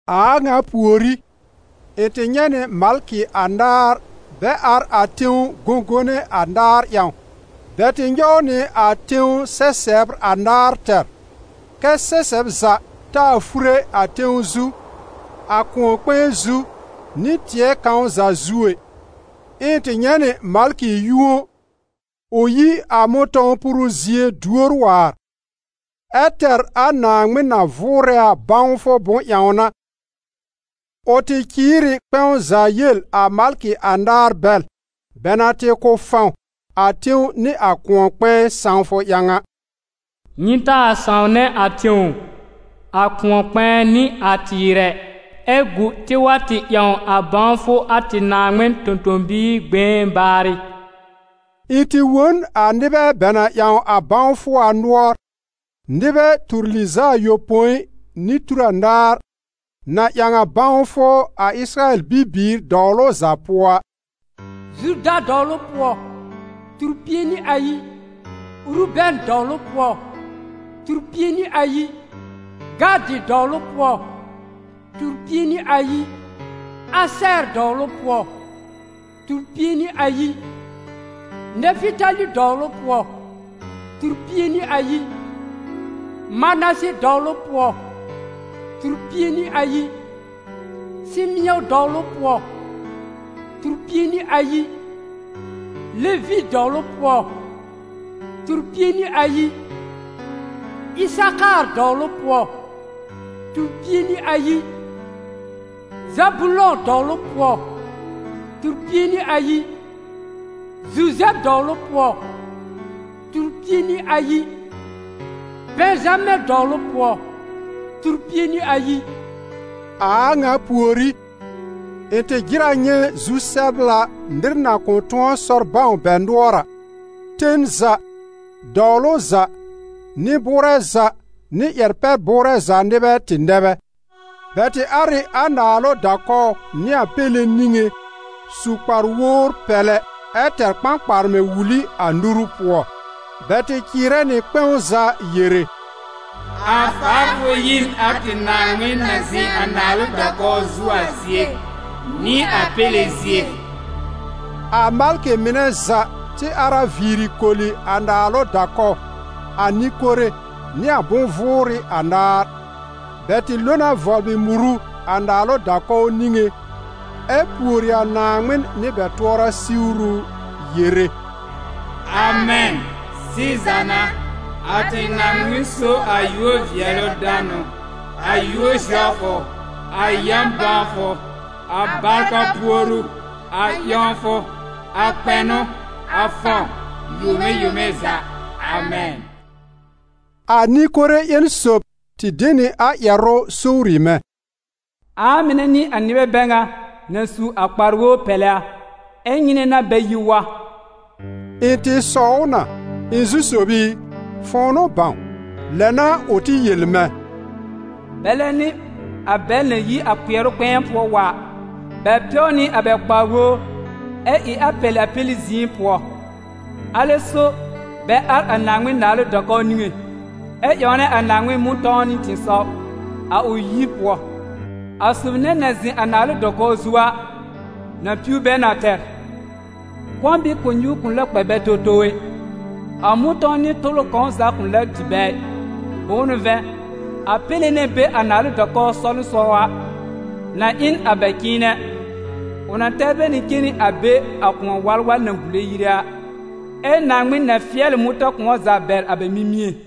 A a ŋa pùorí, ɩ̃ tɩ nyɛ̃ nɩ malkɩ anaar bɛ ar a tẽw gõgone anaar ƴãw. Bɛ tɩ nyɔw nɩ a tẽw sɛsɛbr anaar tɛr, kɛ́ sɛsɛb za taa fure a tẽw zu, a kʋ̃ɔ-kpɛ̃ɛ zu nɩ tɩɛ kãw za zu ɛ. Ɛ ɩ̃ tɩ nyɛ̃ nɩ malkɩ yũo, ʋ yi a mʋ̃tɔ̃w puru zie duor waar, ɛ tɛr a Naaŋmɩn na vʋʋrɛ a bãwfʋ bʋ̃-ƴãwna. Ʋ tɩ cɩɩr ɩ kpɛ̃w za yel a malkɩ anaar bɛl, bɛ na tɩ kʋ̀ fãw a tẽw nɩ a kʋ̃ɔ-kpɛ̃ɛ sãwfʋ ƴãw a: «Nyɩ taa sãwnɛ a tẽw, a kʋ̃ɔ-kpɛ̃ɛ nɩ a tɩɩr ɛ, ɛ gu tɩ wa tɩ ƴãw a bãwfʋ a tɩ Naaŋmɩn tõ-tõ-biir gbẽé baarɩ.» Ɩ̃ tɩ wõ n a nɩbɛ bɛ na ƴãw a bãwfʋ a nʋɔr: nɩbɛ tur lɩz'a ayopõi nɩ tur anaar, na ƴãw a bãwfʋ a Ɩsɩrayɛl bibiir dɔwlʋ za pʋɔ a: Zuda dɔwlʋ pʋɔ, tur-pie nɩ ayi; Urubɛn dɔwlʋ pʋɔ, tur-pie nɩ ayi; Gadɩ dɔwlʋ pʋɔ, tur-pie nɩ ayi; Asɛɛr dɔwlʋ pʋɔ, tur-pie nɩ ayi; Nɛfɩtali dɔwlʋ pʋɔ, tur-pie nɩ ayi; Manase dɔwlʋ pʋɔ, tur-pie nɩ ayi; Sɩmɩ̃ɔ dɔwlʋ pʋɔ, tur-pie nɩ ayi; Levi dɔwlʋ pʋɔ, tur-pie nɩ ayi; Ɩsakaar dɔwlʋ pʋɔ, tur-pie nɩ ayi; Zabulɔ̃ dɔwlʋ pʋɔ, tur-pie nɩ ayi; Zuzɛb dɔwlʋ pʋɔ, tur-pie nɩ ayi; Bɛ̃zamɛ dɔwlʋ pʋɔ tur-pie nɩ ayi. A a ŋa pùorí, ɩ̃ tɩ jɩr a nyɛ̃ zu-sɛbla nɩr na kʋ̃ tʋ̃ɔ sɔr bãw bɛ nʋɔr a. Ten za, dɔwlʋ za, nɩ-bʋʋrɛ za nɩ ƴɛr-pɛ-bʋʋrɛ za nɩbɛ tɩ nɛ bɛ. Bɛ tɩ ar ɩ a naalʋ da-kɔw nɩ a Péle niŋé, su kpar-wowr pɛlɛ ɛ tɛr kpãkparmɛ̃ wuli a nuru pʋɔ. Bɛ tɩ cɩɩrɛ nɩ kpɛ̃w za yere: «A faafʋ yi n a tɩ Naaŋmɩn na zɩ̃ a naalʋ da-kɔw zu a zie, nɩ a Péle zie!» A malkɩ mɩnɛ za tɩ ar a viiri koli a naalʋ da-kɔw, a nɩ-kore nɩ a bʋ̃-vʋʋrɩ anaar. Bɛ tɩ lo na vɔblɩ muru a naalʋ da-kɔw niŋé, ɛ pùori a Naaŋmɩn nɩ bɛ tʋɔra siwru, yere: « Amɛn! Sɩza n'a, a tɩ Naaŋmɩn so a yúor-vɩɛlʋ-danʋ, a yúor-zɛwfʋ, a yã-bãwfʋ, a barka puoru, a ƴãwfʋ, a kpɛnʋ, a fãw, yome yome za! Amɛn!» A nɩ-kore ƴẽn sob tɩ de nɩ a ƴɛrʋ sowri mɛ̃: «Ãa mɩnɛ n'ɩ a nɩbɛ bɛ ŋa na su a kpar-wowr pɛlɛ a, ɛ́ nyɩnɛ n'a bɛ yi wa?» Ɩ̃ tɩ sɔw ʋ na: «Ɩ̃ Zu-sob i, fʋ̃ʋ n'ʋ bãw.» Lɛ n'a ʋ tɩ yel mɛ̃: «Bɛlɛ n'ɩ a bɛl na yi a kpɩɛrʋ kpɛ̃ɛ pʋɔ wa a. Bɛ pɛw nɩ a bɛ kpar-wowr, ɛ ɩ a pɛlɩ a Péle zɩ̃ɩ pʋɔ. Alɛ so bɛ ar a Naaŋmɩn naalʋ da-kɔw niŋé, ɛ ƴãwnɛ a Naaŋmɩn mʋ̃tɔ̃w nɩ tɩ̃ɩsɔw, a ʋ yir pʋɔ. A sob nɛ na zɩ̃ a naalʋ da-kɔw zu a, na piw bɛ na tɛr. Kɔ̃ bɩɩ kʋ̃ɔ-nyuur kʋ̃ lɛ kpɛ bɛ towtow ɛ, a mʋ̃tɔ̃w nɩ tʋlʋ kãw za kʋ̃ lɛ dɩ bɛ ɩ. Bʋ̃ʋ n'ʋ vɛ̃, a Péle na be a naalʋ da-kɔw sɔwlɩsɔw a, na ɩ n a bɛ cɩ̃ɩnɛ, ʋ na tɛr bɛ na cen nɩ a be a kʋ̃ɔ-walwal na bùle yire a. Ɛ́ Naaŋmɩn na fɩɛl ɩ mʋ̃tã-kʋ̃ɔ za bɛr a bɛ mimĩé.»